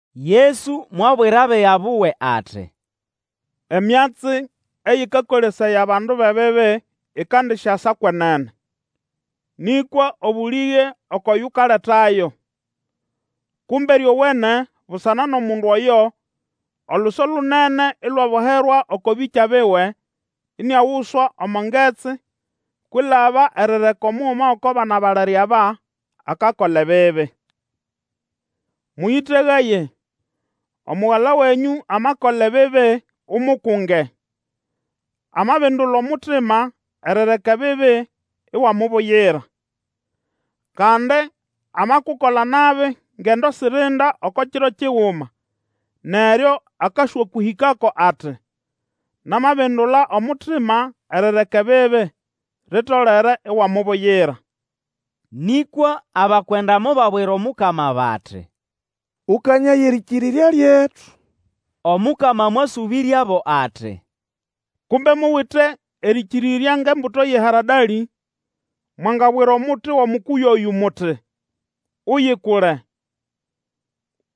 Yesu mwabwira abiga buwe ati, Emyatsi eyĩkakolesaya abandu bʼebibi ikandisyasa kwenene, nĩkwa obũlĩge oko yukaletayo! Kumbe ryowene busana nʼomundu oyo oluso lunene ilwaboherwa oko bĩkya biwe, iniaguswa omo ngetsi; kwilaba erireka omuguma gʼoko bana balere aba akakola ebibi. Mũyĩtegaye! Omugala wenyũ amakola ebibi, umukunge; amabindula omutima erireka ebibi iwamubuyira. Kandi amakukola nabi ngendo sirinda oko kiro kiguma, neryo akaswakũhĩkako ati, Namabindula omutima erireka ebibi, litolere iwamubuyira. Nĩkwa abakwenda mobabwira Omukama bati, Ũkanyaye erĩkĩrĩrya lyetu! Omukama mwasũbĩryabo ati, Kumbe muwite erĩkĩrĩrya ngʼembuto yʼeharadalĩ, mwangabwira omuti wʼomukuyu oyũ muti, Uyikule,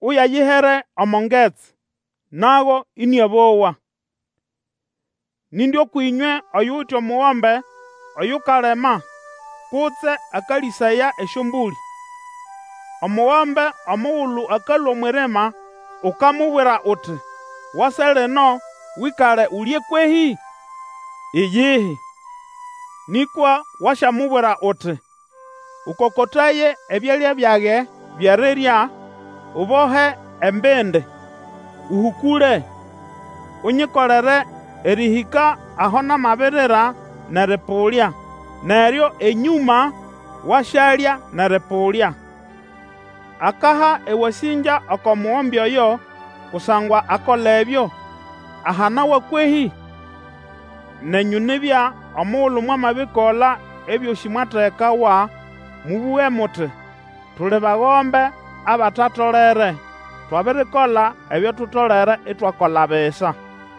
uyayihere omo ngetsi, nago ĩnĩabowa. Nindi ũkwʼĩnywe oyuwite omugombe Oyukalima kutse akalĩsaya esyombũlĩ. Omugombe omugulu akalũa omwʼirima ukamubwira uti, Wase lino Wĩkale ulye kwehĩ? Iyihi, nĩkwa Wasyamubwira uti, Ũkokotaye ebyalya byage byʼerirya, Ubohe embindi, ũhũkũle, unyikolere erĩhĩka aho namabirira nʼerĩpũlya, neryo enyũma wasyalya nʼerĩpũlya. Akaha ewasĩngya oko mugombe oyo kusangwa akola ebyo ahanawa kwehĩ? Nenyũ nibya, omugulu mwamabikola ebyosĩ mwategekawa, mũbũge muti, Tuli bagombe abatatolere; twabirikola ebyo tutolere itwakola bisa.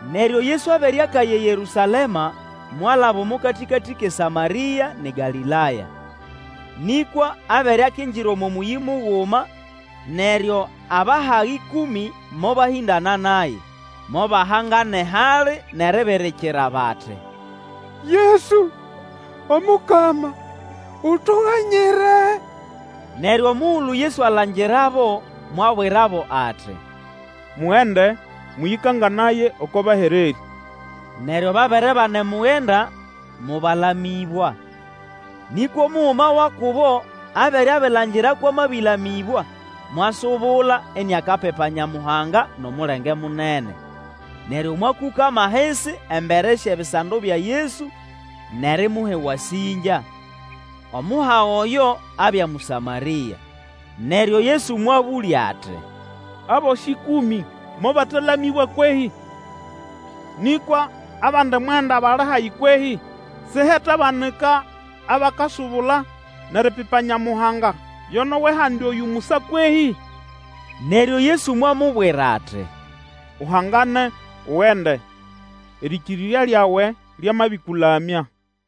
Neryo Yesu abere akaya eYerũsalema, mwalaba omo katĩkatĩ kʼeSamarĩa nʼeGalĩlaya. Nĩkwa abere, akingira omo mũyĩ muguma, neryo abahaga ĩkũmĩ mobahĩndana naye. Mobahangana ehali nʼeribirikira bati, Yesu, Omukama, utuganyire! Neryo omugulu Yesu alangirabo, mwabwirabo ati, Mugende mũyĩkanganaye oko bahererĩ. Neryo babere banemugenda, mobalamĩbwa. Nĩkwa omuguma wa kubo abere abilangira kwʼamabĩlamĩbwa, mwasubula iniakapipa Nyamuhanga nʼomulenge munene. Neryo mwakũkama ahisi embere syʼebisando bya Yesu, nʼerimuha ewasĩngya. Omuhaga oyo abya Mũsamarĩa. Neryo Yesu mwabũlya ati, Abosĩ ĩkũmĩ mobatalamĩbwa kwehĩ? Nĩkwa abandi mwenda bali hahi kwehĩ? Sihetabanika abakasubula nʼeripipa Nyamuhanga yo nʼowʼehandi oyũ musa kwehĩ? Neryo Yesu mwamubwira ati, Uhangane, ugende; erĩkĩrĩrya lyawe lyamabĩkũlamya.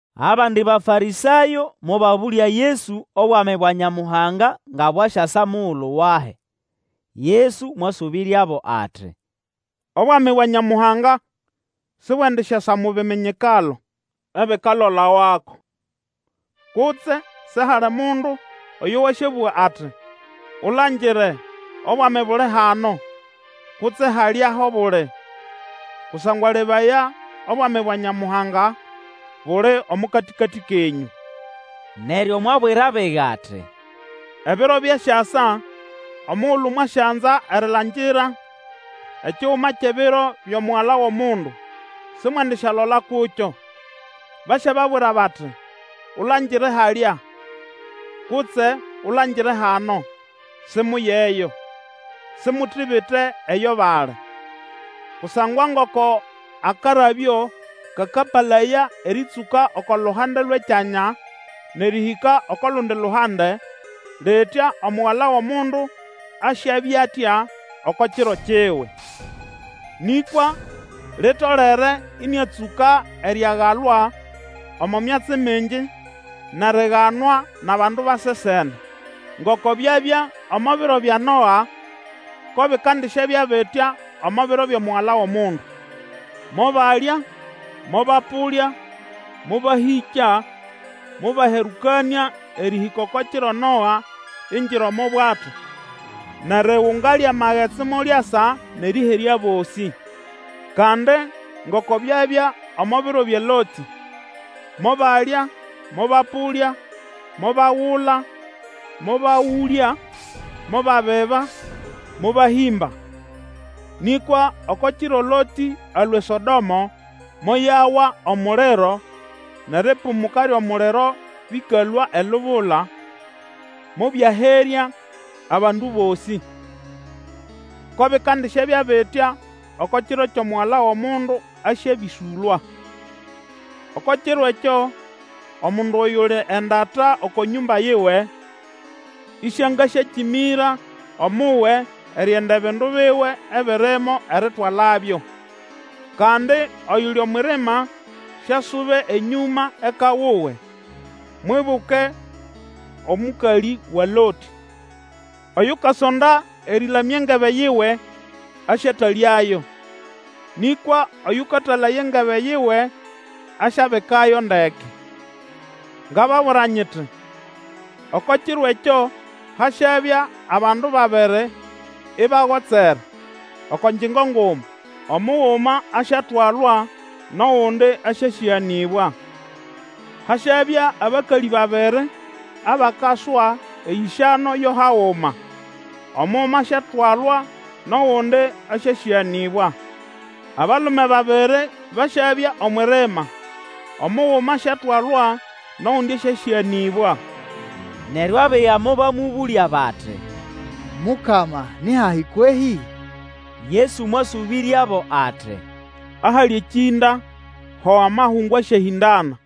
Abandi Bafarĩsayo mobabũlya Yesu Obwami bwa Nyamuhanga nga bwasyasa mugulu wahi. Yesu mwasũbĩryabo ati, Obwami bwa Nyamuhanga sibwendisyasa mo biminyikalo ebikalolawako. Kutse sihali mundu oyo wasyabũga ati, Ulangire, Obwami buli hano, kutse, Halya ho buli! Kusangwa lebaya, Obwami bwa Nyamuhanga buli omo katĩkatĩ kenyũ. Neryo mwabwira abiga ati, Ebiro byasyasa omugulu mwasyanza erilangira ekiguma kyʼebiro byʼomugala wʼOmundu, simwendisyalola kukyo. Basyababwira bati, Ulangire halya! kutse, Ulangire hano! Simuyeyo, simutibite eyo bali. Kusangwa ngoko akarabyo kakapalaya erĩtsũka oko luhande lwʼekyanya nʼerĩhĩka oko lundi luhande, litya Omugala wʼOmundu asyabya atya oko kiro kiwe. Nĩkwa litolere ĩnĩatsũka eriagalwa omo myatsi mingi nʼeriganwa nʼabandu ba sesene. Ngoko byabya omo biro bya Noa, ko bikandisyabya bitya omo biro byʼomugala wʼOmundu. Mobalya, mobapũlya, mobahĩkya, mobaherũkanĩa erĩhĩka oko kiro Noa ingira omo bwato, nʼerigunga lyʼamagetsi molyasa nʼerĩherya abosĩ. Kandi ngoko byabya omo biro bya Lotĩ, mobalya, mobapũlya, mobagula, mobagũlya, mobabiba, mobahĩmba. Nĩkwa oko kiro Lotĩ alũa eSodomo, moyawa omuliro nʼeripumuka lyʼomuliro bĩkalũa elubula, mobyaherya abandu bosĩ. Ko bikandisyabya bitya oko kiro Mugala wʼOmundu asyabĩsũlwa. Oko kiro ekyo, omundu oyuli endata oko nyũmba yiwe, ĩsĩangasyakĩmĩra omuwe erienda ebindu biwe ebirimo eritwalabyo; kandi oyuli omwʼirima siasube enyũma eka wuwe. Mwibuke omũkalĩ wa Lotĩ! Oyukasonda erĩlamya engebe yiwe, asyatalyayo, nĩkwa Oyũkatalaya engebe yiwe asyabikayo ndeke. Ngababwira nyiti, Oko kiro ekyo hasyabya abandu babiri ibagotsere oko ngyingo nguma, omuguma asyatwalwa, nʼogundi asyasĩganĩbwa. Hasyabya abakalĩ babiri abakaswa eyĩsyano yo haguma, omuguma asyatwalwa, nʼogundi asyasĩganĩbwa. [ Abalume babiri basyabya omwʼirimai omuguma asyatwalwa, nʼogundi asyasĩganĩbwa.] Neryo abiga mobamũbũlya bati, Mukama ni hahi kwehĩ? Yesu mwasũbĩryabo ati, Ahali ekĩnda, ho amahungu asyahĩndana.